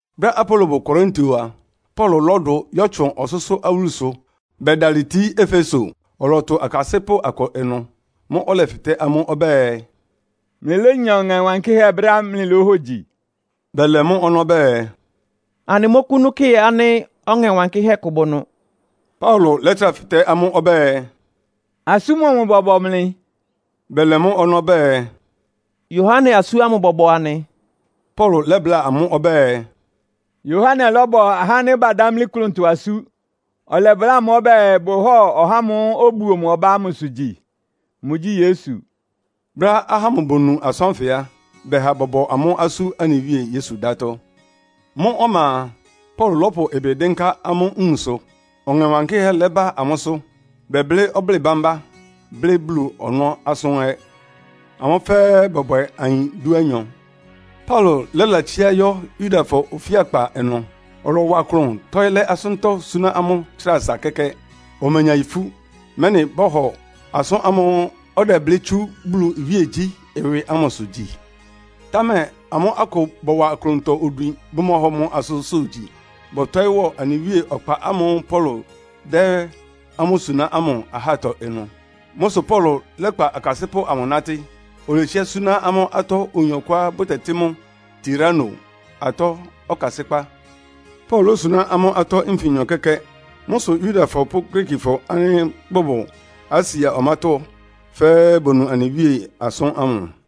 Brɛ́á Apolo bʋ Korinto a, Paulo lɔ́dʋ yɔ́tsʋn ɔsʋ́sʋ́ awúlusʋ bɛdalɩ tíí Efeso. Ɔlɔtʋ akasɩ́pʋ́ akʋ ɩnʋ. Mʋ́ʋ́ ɔlɛfɩtɛ́ amʋ́ ɔbɛ́ɛ, “Mlɩlénya Ɔŋɛ Wankɩ́hɛ́ brɛ́á mlɩlóhogyi?” Bɛlɛ mʋ́ ɔnɔ́ bɛɛ, “Anɩmɔ́kʋ́nú kɩ ánɩ́ Ɔŋɛ Wankɩ́hɛ́ kʋ bʋ ɩnʋ.” Paulo lɛ́trá fɩtɛ́ amʋ́ ɔbɛ́ɛ, “Asú mɔmʋ bɔbɔ mlɩ?” Bɛlɛ mʋ́ ɔnɔ́ bɛɛ, “Yohane asú ámʋ bɔbɔ anɩ.” Paulo lɛ́bláa amʋ́ ɔbɛ́ɛ, “Yohane lɔ́bɔ ahá ánɩ́ badámlí klʋntɔ asú. Ɔlɛbláa amʋ́ ɔbɛ́ɛ bʋhɔ́ɔ ɔhá ámʋ́ʋ́ obuo mʋ ɔbá ámʋsʋ gyi. Mʋgyí Yesu.” Brɛ́á ahá ámʋ bonu asʋ́n ánfɩ á, bɛha bɔbɔ amʋ́ asú anɩ Wíe Yesu dátɔ́. Mʋ́ ɔma a, Paulo lɔ́pʋ ɩbɩ dɩ́nká amʋ́ nwunsʋ, Ɔŋɛ Wankɩ́hɛ́ lɛba amʋ́sʋ́. Bɛblɩ́ ɔblɩ́ɩ bámbá, blɩ́ Bulu ɔnɔ́ asʋ́n ɛ́. Amʋ́ fɛ́ɛ́ bɔ́bwɛ ayin dúanyɔ. Paulo lɛ́latsiá yɔ́ Yudafɔ ofíakpa ɩnʋ. Ɔlɔwa klʋn tɔ́ɩ́ lɛ́ asʋ́ntɔ́ súná amʋ́ tsra asa kɛ́kɛ́. Omenya ifú, mɛ́nɩ bɔ́hɔ asʋ́n ámʋ́ʋ́ ɔdɛblɩ́ tsú Bulu iwíegyí ɩwɩ ámʋsʋ gyi. Támɛ amʋ́ akʋ bɔwa klʋntɔ odwin, bʋmɔhɔ mʋ asʋ́nsʋ́ gyi. Bɔtɔɩ́ wɔ anɩ Wíe Ɔkpa ámʋ́ʋ́ Paulo dɛ́ amʋ́ súná ámʋ ahátɔ ɩnʋ. Mʋ́ sʋ Paulo lɛ́kpa akasɩ́pʋ́ amʋ nátɩ́, oletsiá súná amʋ́ atɔ́ oyin ɔkʋá bʋtɛtɩ́ mʋ Tirano atɔ́ ɔkasɩ́kpá. Paulo lósuná amʋ́ atɔ́ nfinyɔ kɛ́kɛ́. Mʋ́ sʋ Yudafɔ pʋ́ Griikifɔ ánɩ́ bʋbʋ Asia ɔmátɔ́ fɛ́ɛ́ bonu anɩ Wíe asʋ́n ámʋ.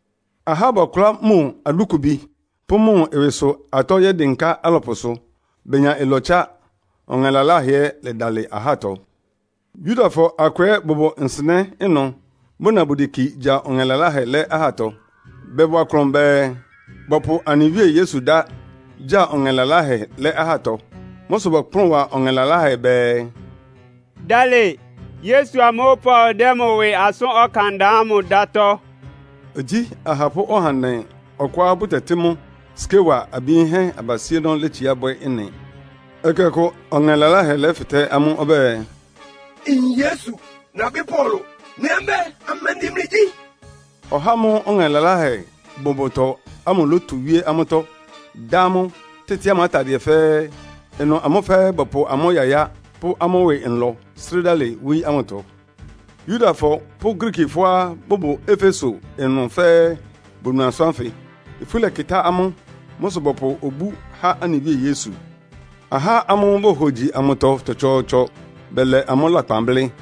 Ahá bɔkʋlá mʋ adúkubi pʋ́ mʋ ɩwɩsʋ atɔ́ yɛ́dɩnká alɔpʋsʋ, benya ɩlɔtsá, ɔŋɛ laláhɛ ɛ́ lɛdalɩ ahátɔ. Yudafɔ akʋ ɛ́ bʋbʋ nsɩnɛ́ ɩnʋ bʋna bʋdeki gya ɔŋɛ laláhɛ lɛ́ ahátɔ. Bɔwa klʋn bɛɛ, bɔ́pʋ anɩ Wíe Yesu dá gya ɔŋɛ laláhɛ lɛ́ ahátɔ. Mʋ́ sʋ bɔkplʋ́n wa ɔŋɛ laláhɛ bɛɛ, “Dalɩ Yesu amʋ́ʋ́ Paulo dɛ́ mʋ ɩwɩ asʋ́n ɔkan da ámʋ dátɔ́.” Igyí ahapʋ́ ɔhandɛ ɔkʋá bʋtɛtɩ́ mʋ Skewa abi yinhɛ́ abasíénɔ́ létsiá bwɛ́ ɩ́nɩ. Ɛkɛ ɔkʋ ɔŋɛ laláhɛ lɛ́fɩtɛ́ amʋ́ ɔbɛ́ɛ, “Nyin Yesu, nabɩ́ Paulo, mlɩ ɛ́ mɛ́, amɛndɩ mlɩgyí?” Ɔhá ámʋ́ʋ́ ɔŋɛ laláhɛ bʋ mʋtɔ ámʋ lótu wíé amʋ́tɔ́, dá amʋ́, tɩ́tɩ amʋ́ atadɩɛ fɛ́ɛ́. Ɩnʋ amʋ́ fɛ́ɛ́ bɔpʋ amʋ́ yayá pʋ́ amʋ́ ɩwɩ nlɔ srɩ́ dalɩ wóyí ámʋtɔ. Yudafɔ pʋ́ Griikifɔá bʋbʋ Efeso ɩnʋ fɛ́ɛ́ bonu asʋ́n ánfɩ. Ifú lɛkɩtá amʋ́. Mʋ́ sʋ bɔpʋ obú há anɩ Wíe Yesu. Ahá ámʋ́ʋ́ bohogyi amʋtɔ tsɔtsɔɔtsɔ bɛlɛ amʋ́ lakpan blɩ́.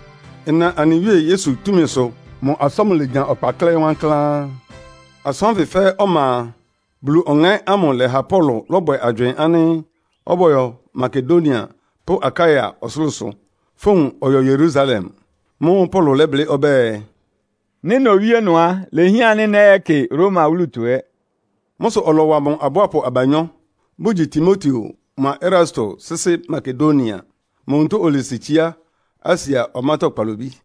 Ɩna anɩ Wíe Yesu túmisʋ mʋ asʋ́n ámʋ lenya ɔkpa klɛ́ɩ́ wankláán. Asʋ́n ánfɩ fɛ́ɛ́ ɔma a, Bulu Ɔŋɛ́ ámʋ lɛ́ha Paulo lɔ́bwɛ agywɩɩn ánɩ́ ɔbɔ́yɔ Makedonia pʋ́ Akaia ɔsʋlʋ́sʋ, fówun ɔyɔ Yerusalem. Mʋ́ʋ́ Paulo lɛ́blɩ́ ɔbɛ́ɛ, “Nɩ́ nowíé ɩnʋ á, ilehián ánɩ́ nɛ́yɛ́kɩ Roma wúlutɔ ɛ́.” Mʋ́ sʋ ɔlɔwa mʋ abʋápʋ abanyɔ́, bʋgyi Timoteo mʋa Erasto sɩ́sɩ́ Makedonia. Mʋ onutó olesi tsiá Asia ɔmátɔ́ kpalobí.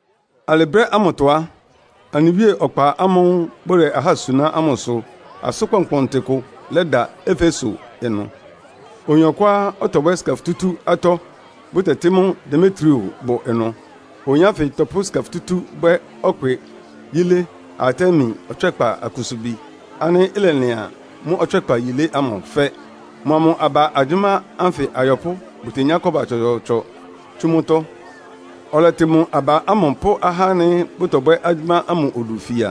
Alɩ brɛ́ ámʋtɔ á, anɩ Wíe Ɔkpa ámʋ́ʋ́ bʋdɛ ahá suná ámʋ sʋ asʋ́n kpɔnkpɔntɩ kʋ lɛda Efeso ɩnʋ. Oyin ɔkʋá ɔtɔbwɛ́ sika futútú atɔ́, bʋtɛtɩ́ mʋ Demetrio bʋ ɩnʋ. Oyin ánfɩ tɔpʋ́ sika futútú bwɛ́ ɔkpɩ yílé Artemi ɔtswɛ́kpa akusubi ánɩ́ ɩlɛlɩan mʋ ɔtswɛ́kpa yílé ámʋ fɛ́. Mʋa mʋ aba agyʋ́má ánfɩ ayɔpʋ́ bʋtenyá kɔ́ba tsɔtsɔɔtsɔ tsú mʋ́tɔ́. Ɔlɛtɩ mʋ aba ámʋ pʋ́ ahá ánɩ́ bʋtɔbwɛ́ agyʋ́má ámʋ odu fia.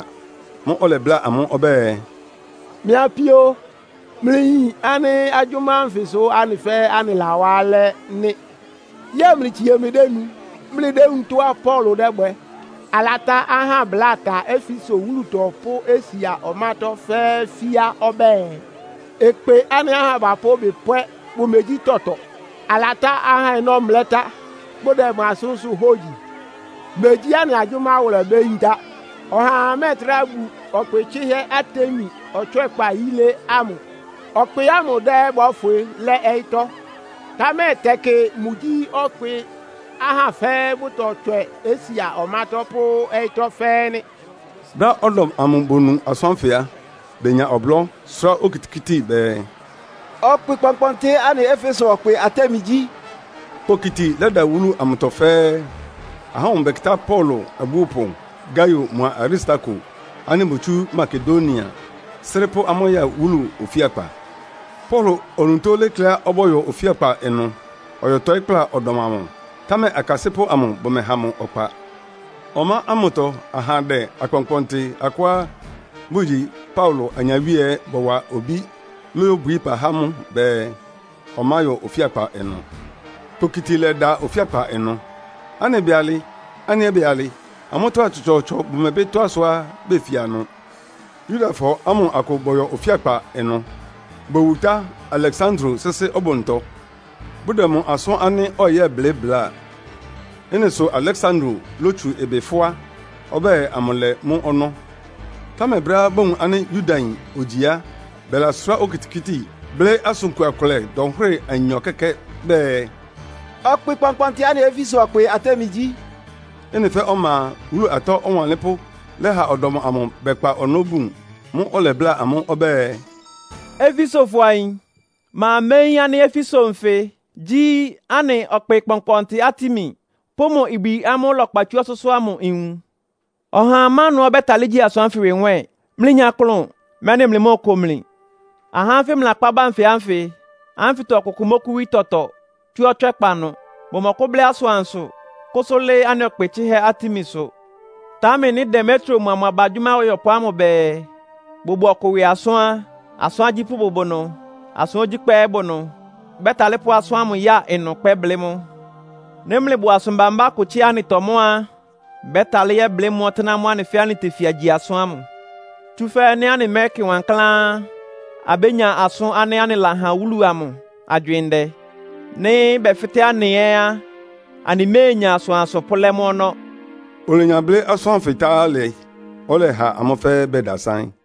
Mʋ́ʋ́ ɔlɛbláa amʋ́ ɔbɛ́ɛ, “Mɩ́ apíó, mlɩyin ánɩ́ agyʋ́má ánfɩ sʋ́ anɩ fɛ́ɛ́ anɩlawá alɛ́ nɩ́. Yɛ́ɛ mlɩtsie mlɩdénu, mlɩdéwúun tɔ́á Paulo dɛ́bwɛ? Alatá ahá bláa ta Efeso wúlutɔ pʋ́ Asia ɔmátɔ́ fɛ́ɛ́ fía ɔbɛ́ɛ, ɩkpɩ ánɩ́ ahá bapʋ́ ɩbɩ pwɛ́ bʋmegyí tɔtɔ. Alatá ahá ɔnɔ́ mlɛ́ tá, bʋdɛ mʋ asʋ́nsʋ́ hógyi. Megyí anɩ agyʋ́má wʋlɛ ibéyintá. Ɔhaa mɛ́ɛtrá bu ɔkpɩ tsɩ́hɛ́ Artemi ɔtswɛ́kpa yílé ámʋ. Ɔkpɩ ámʋ dá ɛ́ bɔ́fwɩ lɛ́ ɔyɩ́tɔ́. Támɛ tɛkɩ mʋgyí ɔkpɩá ahá fɛ́ɛ́ bʋtɔtswɛ Asia ɔmátɔ́ pʋ́ ɔyɩ́tɔ́ fɛ́ɛ́ nɩ́.” Brɛ́á ɔdɔm amʋ bonu asʋ́n ánfɩ á, benya ɔblɔ́, sʋ́rá okitikíti bɛɛ, “Ɔkpɩ kpɔnkpɔntɩ anɩ Efesofɔ ɔkpɩ Artemi gyí!” Kpokiti lɛda wúlu amʋtɔ fɛ́ɛ́. Ahá ámʋ bɛkɩtá Paulo abúopʋ Gaio mʋa Aristarko ánɩ́ botsú Makedonia srɩ́ pʋ́ amʋ́ ya wúlu ofíakpa. Paulo onutó lékléá ɔbɔ́yɔ ofíakpa ɩnʋ, ɔyɔtɔɩ́ kpla ɔdɔm amʋ, támɛ akasɩ́pʋ́ amʋ bʋmɛha mʋ ɔkpa. Ɔmá ámʋtɔ ahandɛ akpɔnkpɔntɩ akʋá bʋgyi Paulo anyawíe ɛ́ bɔwa obí lóyóbwií ɩpa há mʋ bɛɛ, ɔmáyɔ ofíakpa ɩnʋ. Kpokiti lɛ́da ofíakpa ɩnʋ. Ánɩ bɛɛ alɩ, anɩ ɛ́ bɛɛ alɩ. Amʋ́tɔ́ ahá tsɔtsɔɔtsɔ bʋmɛbɩ tɔ́á sʋá befia ɩnʋ. Yudafɔ ámʋ akʋ bɔyɔ ofíakpa ɩnʋ. Bowutá Aleksandro sɩ́sɩ́ ɔbʋntɔ, bʋdɛ mʋ asʋ́n ánɩ́ ɔyɛ́blɩ́ bláa. Ɩ́nɩ sʋ Aleksandro lótsu ɩbɩ fʋ́á, ɔbɛ́ɛ amʋlɛ mʋ ɔnɔ́. Támɛ brɛ́á bowun ánɩ́ Yudayin ogyi á, bɛlasʋ́rá okitikíti, blɩ́ asʋn kua kʋlɛ dɔnhwɩ́rɩ anyɔ kɛ́kɛ́ bɛɛ “Ɔkpɩ kpɔnkpɔntɩ anɩ Efesofɔ ɔkpɩ Artemi gyí!” Ɩ́nɩ fɛ́ɛ́ ɔma a, wúlu atɔ́ ɔwanlɩ́npʋ́ lɛ́ha ɔdɔm amʋ bɛkpa ɔnɔ́ bun. Mʋ́ʋ́ ɔlɛbláa amʋ́ ɔbɛ́ɛ, “Efesofɔ ayin, ma méyín ánɩ́ Efeso nfɩ gyí anɩ ɔkpɩ kpɔnkpɔntɩ Artemi pʋ́ mʋ ibwi ámʋ́ʋ́ ɩlɛkpa tsú ɔsʋ́sʋ́ ámʋ nwun? Ɔhaa má ɩnʋá ɔbɛ́talɩ́ gyí asʋ́n ánfɩ ɩwɩ nwɛ́ɛn? Mlɩnya klʋn, mɛ́nɩ mlɩmóoko mli. Ahá ánfɩ mlɩlakpá ba nfɩ ánfɩtɔ ɔkʋkʋ mɔ́kʋ́wí tɔtɔ tsú ɔtswɛ́kpa ɩnʋ. Bʋmɔkʋ́blɩ́ asʋansʋ kʋ́sʋ́ lɩ́ɩ́ anɩ ɔkpɩ tsɩ́hɛ́ Artemisʋ. Támɛ nɩ́ Demetrio mʋa mʋ aba agyʋ́má ayɔpʋ́ amʋ bɛɛ bʋbʋ ɔkʋ ɩwɩ asʋ́n á, asʋ́n agyípʋ́ bʋbʋ ɩnʋ, asʋ́n ogyíkpá ɛ́ bʋ ɩnʋ. Bɛ́talɩ́ pʋ́ asʋ́n ámʋ ya ɩnʋ kpɛ́blɩ́ mʋ́. Nɩ́ mlɩbʋ asʋn bambá kʋ tsɩ́a ɩ́nɩtɔ mʋ́ á, bɛ́talɩ́ yɛ́blɩ́ mʋ́ ɔtɩ́nɛ́ ámʋ́ʋ́ anɩ fɛ́ɛ́ anɩtefia gyi asʋ́n ámʋ. Tsúfɛ́ nɩ́ anɩmɛ́kɩ wankláán á, abénya asʋ́n ánɩ́ anɩlahan wúlu amʋ agywɩɩn ndɛ. Nɩ́ bɛfɩ́tɛ́ anɩ ɛ́ á, anɩméenya asʋansʋ pʋ́lɛ́ mʋ́ ɔnɔ́.” Olenya blɩ́ asʋ́n ánfɩ tá alɩ, ɔlɛha amʋ́ fɛ́ɛ́ bɛdasáɩ́n.